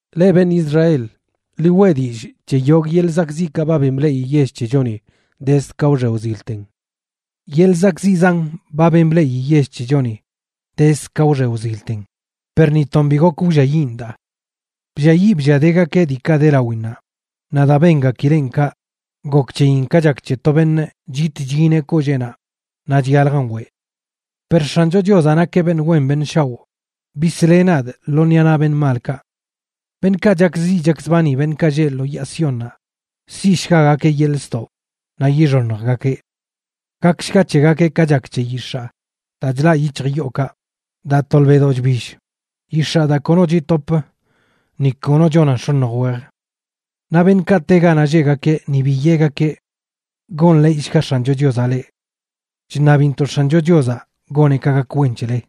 Leꞌ beṉꞌ Israel, ḻi weꞌ dillꞌ c̱he yogꞌ yeḻꞌ zakꞌziꞌkaꞌ ba ben bleꞌi yell c̱hechoni dezd ka wxe wzilten. Yeḻꞌ zakꞌziꞌ zan ba ben bleꞌi yell c̱hechoni dezd ka wxe wzilten, per ni ton bi gok wlliayiꞌn daa. Blliayiꞌ blliadegakeꞌ diikaꞌ de lawinnaꞌ; naꞌ daa bengakileꞌn kaꞌ, gok c̱heyin ka chak c̱he to beṉꞌ chit chyineꞌ kolleenaꞌ naꞌ chyaljan weꞌ. Per X̱ancho Chiozaꞌ nakeꞌ beṉꞌ wen beṉꞌ shaoꞌ, bisleꞌ nadꞌ lo ṉiꞌa naꞌ beṉꞌ malkaꞌ. Beṉꞌkaꞌ chakziꞌ chakzbani beṉꞌkaꞌ lleꞌ lo yaa Siónnaꞌ, siꞌshgagakeꞌ yeḻꞌ ztoꞌ naꞌ yixoṉjgakeꞌ. Gakshga c̱hegakeꞌ ka chak c̱he yix̱aa daa chlaꞌ yic̱hj yookaꞌ, daa tolbeꞌdo chbill, yix̱aa daa kono chitopə, ni kono chonan x̱oṉj wej. Naꞌ beṉꞌkaꞌ te ganaꞌ lleꞌgakeꞌ ni bi yeꞌgakeꞌ: “Gonḻeeyshga X̱ancho Chiozaꞌ leꞌ. Chṉabintoꞌ X̱ancho Chiozaꞌ goneꞌ ka gak wen c̱hele.”